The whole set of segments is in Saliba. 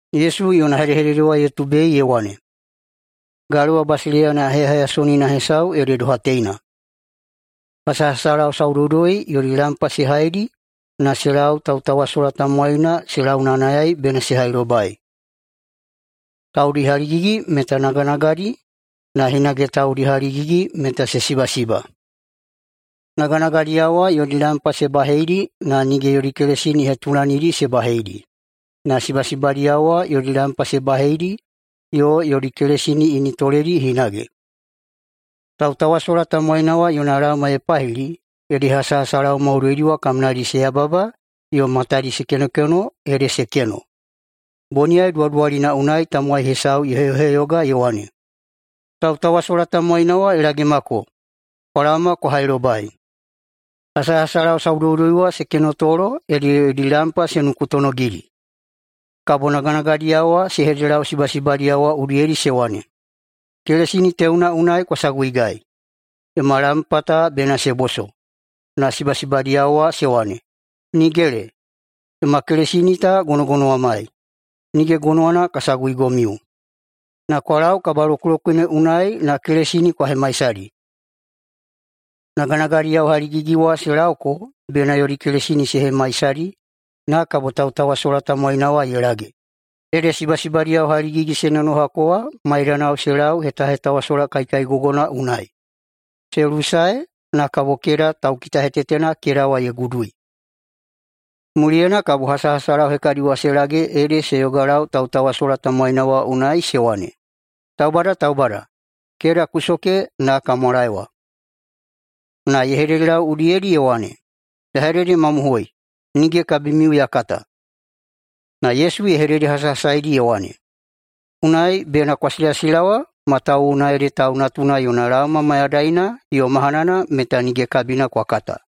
[Yesu yona hedehedede wa ye tubei ye wane,] “Galewa basileiyana heyaheyasonina hesau ede doha teina: Hasahasalao saudoudoi yodi lampa se haidi na se lau tautawasola tamowaina se launayanayai bena se hailobai. Taudi haligigi meta naganagadi na hinage taudi haligigi meta se sibasiba. Naganagadiyao wa yodi lampa se baheidi na nige yodi kelesini hetulanidi se baheidi. Na sibasibadiyao wa yodi lampa se baheidi yo yodi kelesini initoledi hinage. Tautawasola tamowaina wa yona laoma ye pahili ede hasahasalao maudoidi wa kamnadi se yababa yo matadi se kenokeno ede se keno. Boniyai duwaduwalina unai tamowai hesau ye heyoheyoga ye wane, ‘Tautawasola tamowaina wa ye lagemako, kwa laoma kwa hailobai!’ Hasahasalao saudoudoi wa se kenotolo ede yodi lampa se nukutonogidi. Kabo naganagadiyao wa se hededelau sibasibadiyao wa udiyedi se wane, ‘Kelesini teuna unai kwa saguigai! Yoma lampa ta bena se boso.’ Na sibasibadiyao wa se wane, ‘Nigele, yoma kelesini ta gonogonowamai, nige gonowana ka saguigomiu. Na kwa lau kabalokulokune unai yomi kelesini kwa hemaisadi.’ Naganagadiyao haligigi wa se lauko bena yodi kelesini se hemaisadi, na kabo tautawasola tamowaina wa ye lage. Ede sibasibadiyao haligigi se nonohako wa maidanao se lau hetahetawasola kaikaigogona unai. Se lusae, na kabo keda taukitahetetena keda wa ye gudui. Muliyena kabo hasahasalao hekadi wa se lage ede se yogalau tautawasola tamowaina wa unai se wane, ‘Taubada, taubada, keda ku soke na ka mwalaewa!’ Na ye hededelau udiyedi ye wane, ‘Ya hededemamohoi: Nige kabimiu ya kata.’” [Na Yesu ye hededehasahasaidi ye wane,] “Unai bena kwa silasilawa, matawuwuna ede Tau Natuna yona laoma mayadaina yo mahanana meta nige kabina kwa kata.”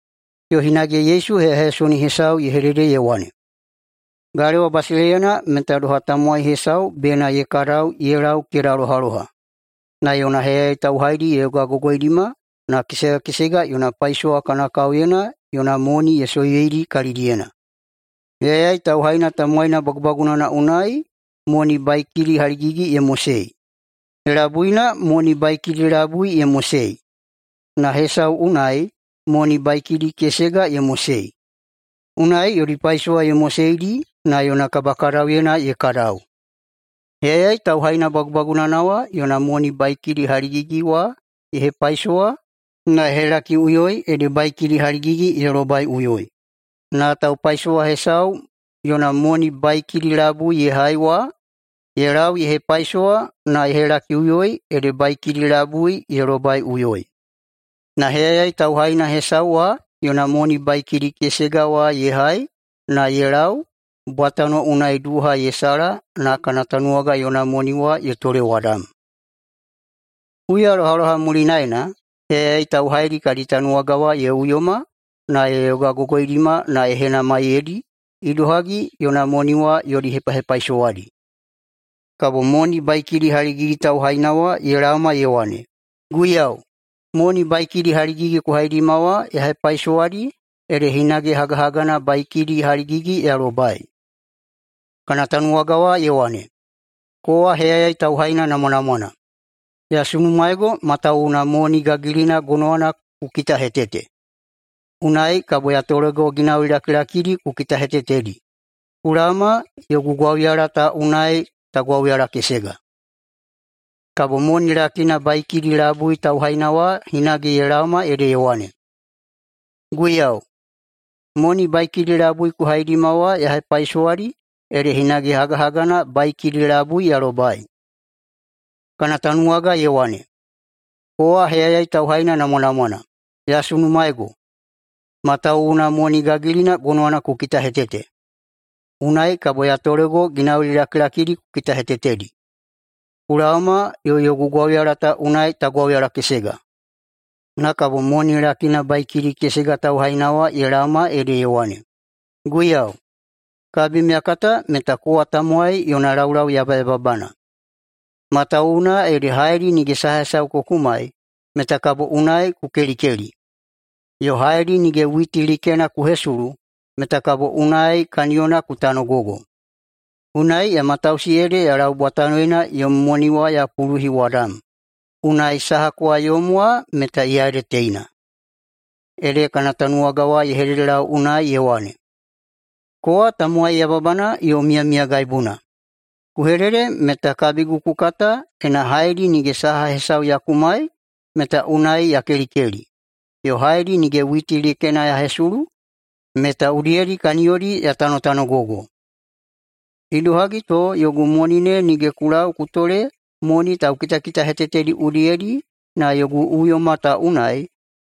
[Yo hinage Yesu heyaheyasoni hesau ye hedede ye wane,] “Galewa Basileiyana meta doha tamowai hesau bena ye kadau ye lau kedalohaloha, na yona heyayai tauhaidi ye yogagogoidima na kesega kesega yona paisowa kana kaoyena yona moni ye soiyeidi kalidiyena. Heyayai tauhaina tamowaina bagubagunana unai moni baikidi haligigi ye mosei, helabuina moni baikidi labui ye mosei, na hesau unai moni baikidi kesega ye mosei. Unai yodi paisowa ye moseidi na yona kabakadauyena ye kadau. Heyayai tauhaina bagubagunana wa yona moni baikidi haligigi wa ye hepaisowa na ye helakiꞌuyoi ede baikidi haligigi ye lobaiꞌuyoi. Na taupaisowa hesau yona moni baikidi labui ye hai wa ye lau ye hepaisowa na ye helakiꞌuyoi ede baikidi labui ye lobaiꞌuyoi. Na heyayai tauhaina hesau wa yona moni baikidi kesega wa ye hai na ye lau, bwatano unai duha ye sala na kana tanuwaga yona moni wa ye tolewadam. Huyalohaloha mulinaena heyayai tauhaidi kadi tanuwaga wa ye uyoma na ye yogagogoidima na ye henamaiyeidi idohagi yona moni wa yodi hepahepaisowadi. Kabo moni baikidi haligigi tauhaina wa ye laoma ye wane, ‘Guiyau, moni baikidi haligigi ku haidima wa ya hepaisowadi ede hinage hagahagana baikidi haligigi ya lobai.’ Kana tanuwaga wa ye wane, ‘Kowa heyayai tauhaina namwanamwana, ya sunumaego matawuwuna moni gagilina gonowana ku kitahetete. Unai kabo ya tolego ginauli lakilakidi ku kitahetetedi. Ku laoma yo yogu gwauyala ta unai ta gwauyalakesega.’ Kabo moni lakina baikidi labui tauhaina wa hinage ye laoma ede ye wane, ‘Guiyau, moni baikidi labui ku haidima wa ya hepaisowadi ede hinage hagahagana baikidi labui ya lobai.’ Kana tanuwaga ye wane, ‘Kowa heyayai tauhaina namwanamwana, ya sunumaego, matawuwuna moni gagilina gonowana ku kitahetete. Unai kabo ya tolego ginauli lakilakidi ku kitahetetedi. Ku laoma yo yogu gwauyala ta unai ta gwauyalakesega.’ Na kabo moni lakina baikidi kesega tauhaina wa ye laoma ede ye wane, ‘Guiyau, kabim ya kata meta kowa tamowai yona laulau yabayababana, matawuwuna ede haedi nige saha hesau ku kumai meta kabo unai ku kelikeli, yo haedi nige witi likena ku hesulu meta kabo unai kaniyona ku tanogogo. Unai ya matausi ede ya lau bwatanoyena yom moni wa ya puluhiwadam, unai saha kowa yom wa meta iya ede teina.’ Ede kana tanuwaga wa ye hededelau unai ye wane, ‘Kowa tamowai yababana yo miyamiyagaibuna! Ku hedede meta kabigu ku kata ena haedi nige saha hesau ya kumai meta unai ya kelikeli, yo haedi nige witi likena ya hesulu meta udiyedi kaniyodi ya tanotanogogo? Idohagi to yogu moni ne nige ku lau ku tole moni taukitakitahetetedi udiyedi na yogu uyoma ta unai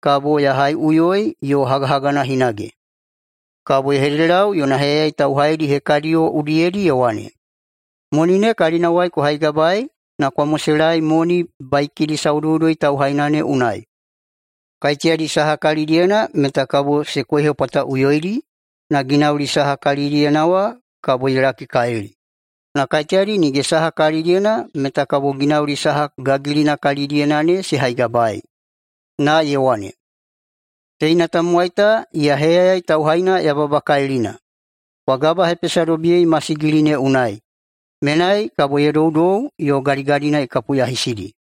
kabo ya haiꞌuyoi yo hagahagana hinage?’ [Kabo ye hededelau yona heyayai tauhaidi hekadiyo udiyedi ye wane,] ‘Moni ne kalinawai kwa haigabaei na kwa moselaei moni baikidi saudoudoi tauhaina ne unai. Kaiteyadi saha kalidiyena meta kabo se koihepwataꞌuyoidi na ginauli saha kalidiyena wa kabo ye lakikalili. Na kaiteyadi nige saha kalidiyena meta kabo ginauli saha gagilina kalidiyena ne se haigabaei.’ Na ye wane, ‘Teina tamowai ta, iya heyayai tauhaina yababakalilina, kwa gabahepesadobiyei masigili ne unai! Menai kabo ye doudou yo gadigadina ye kapuyahisidi.’”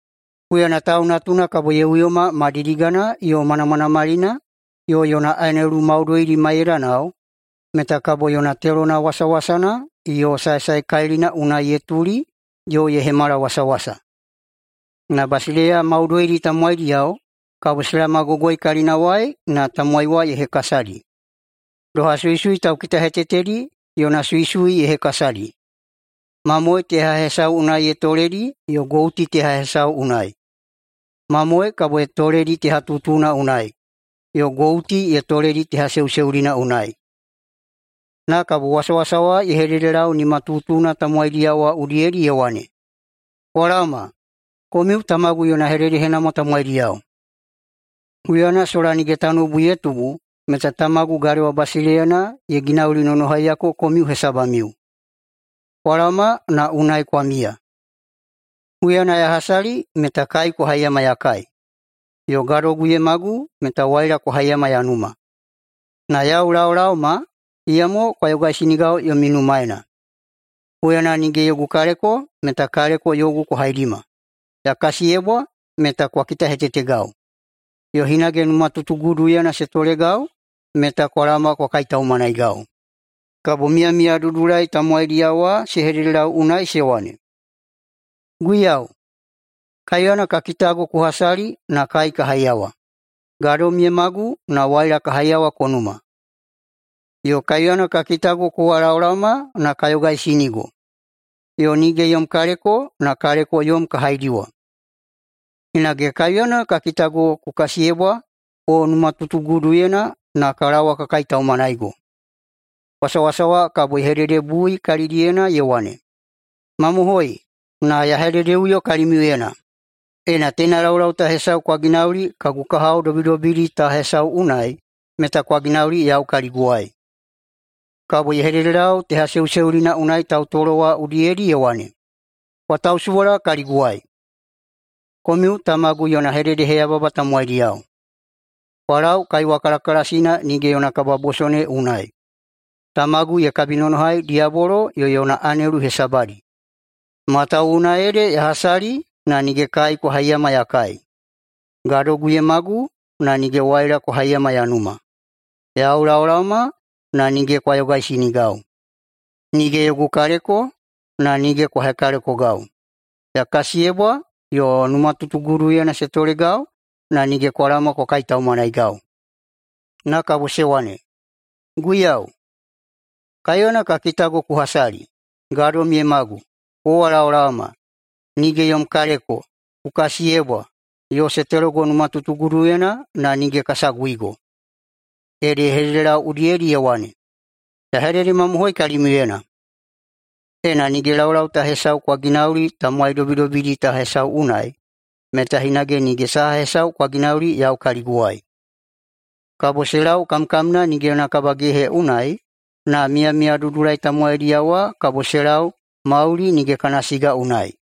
“Huyana Tau Natuna kabo ye uyoma ma didigana yo ma namanamalina, yo yona anelu maudoidi maidanao, meta kabo yona telona wasawasana yo saesaekalilina unai ye tuli yo ye hemala wasawasa. Na basileiya maudoidi tamowaidiyao kabo se laomagogoi kalinawai na tamowai wa ye hekasadi, doha suisui taukitahetetedi yona suisui ye hekasadi, mamoe teha hesau unai ye toledi yo gouti teha hesau unai. Mamoe kabo ye toledi tehatutuna unai, yo gouti ye toledi tehaseuseulina unai. Na kabo wasawasa wa ye hededelau nimatutuna tamowaidiyao wa udiyedi ye wane, ‘Kwa laoma, komiu tamagu yona hededehenamwa tamowaidiyao! Huyana sola nige tanoubu ye tubu meta tamagu galewa basileiyana ye ginaulinonohaiyako komiu hesabamiu. Kwa laoma na unai kwa miya. Huyana ya hasali meta kai kwa haiyama ya kai, yo gadogu ye magu meta waila kwa haiyama ya numa, na yau laolaoma, iyamo kwa yogaisinigau yomi numaena. Huyana nige yogu kaleko meta kaleko yogu kwa haidima, ya kasiyebwa meta kwa kitahetetegau, yo hinage numatutuguduyena se tolegau meta kwa laoma kwa kaitaumanaigau.’ Kabo miyamiyadudulai tamowaidiyao wa se hededelau unai se wane, ‘Guiyau, kaiuyana ka kitago ku hasali na kai ka haiyawa, gadom ye magu na waila ka haiyawa ku numa? Yo kaiuyana ka kitago kowa laolaoma na ka yogaisinigo, yo nige yom kaleko na kaleko yom ka haidiwa? Hinage kaiuyana ka kitago ku kasiyebwa o numatutuguduyena na ka laowa ka kaitaumanaigo?’ Wasawasa wa kabo ye hededebui kalidiyena ye wane, ‘Mamohoi, na ya hededeꞌuyo kalimiuyena: Ena teina laulau ta hesau kwa ginauli kagu kahao dobidobidi ta hesau unai meta kwa ginauli yau kaliguwai.’ Kabo ye hededelau tehaseuseulina unai tautolo wa udiyedi ye wane, ‘Kwa tausuwala kaliguwai, komiu tamagu yona hededeheyababa tamowaidiyao. Kwa lau kaiwa kalakalasina nige yona kababoso ne unai, tamagu ye kabinonohai diyabolo yo yona anelu hesabadi. Matawuwuna ede ya hasali na nige kai kwa haiyama ya kai, gadogu ye magu na nige waila kwa haiyama ya numa. Yau laolaoma na nige kwa yogaisinigau, nige yogu kaleko, na nige kwa hekalekogau, ya kasiyebwa yo numatutuguduyena se tolegau na nige kwa laoma kwa kaitaumanaigau.’ Na kabo se wane, ‘Guiyau, kaiuyana ka kitago ku hasali, gadom ye magu, kowa laolaoma, nige yom kaleko, ku kasiyebwa, yo se tolego numatutuguduyena, na nige ka saguigo?’ Ede ye hededelau udiyedi ye wane, ‘Ya hededemamohoi kalimiuyena: Ena nige laulau ta hesau kwa ginauli tamowai dobidobidi ta hesau unai meta hinage nige saha hesau kwa ginauli yau kaliguwai.’ Kabo se lau kamkamna nige yona kabagehe unai, na miyamiyadudulai tamowaidiyao wa kabo se lau mauli nige kana siga unai.” —————————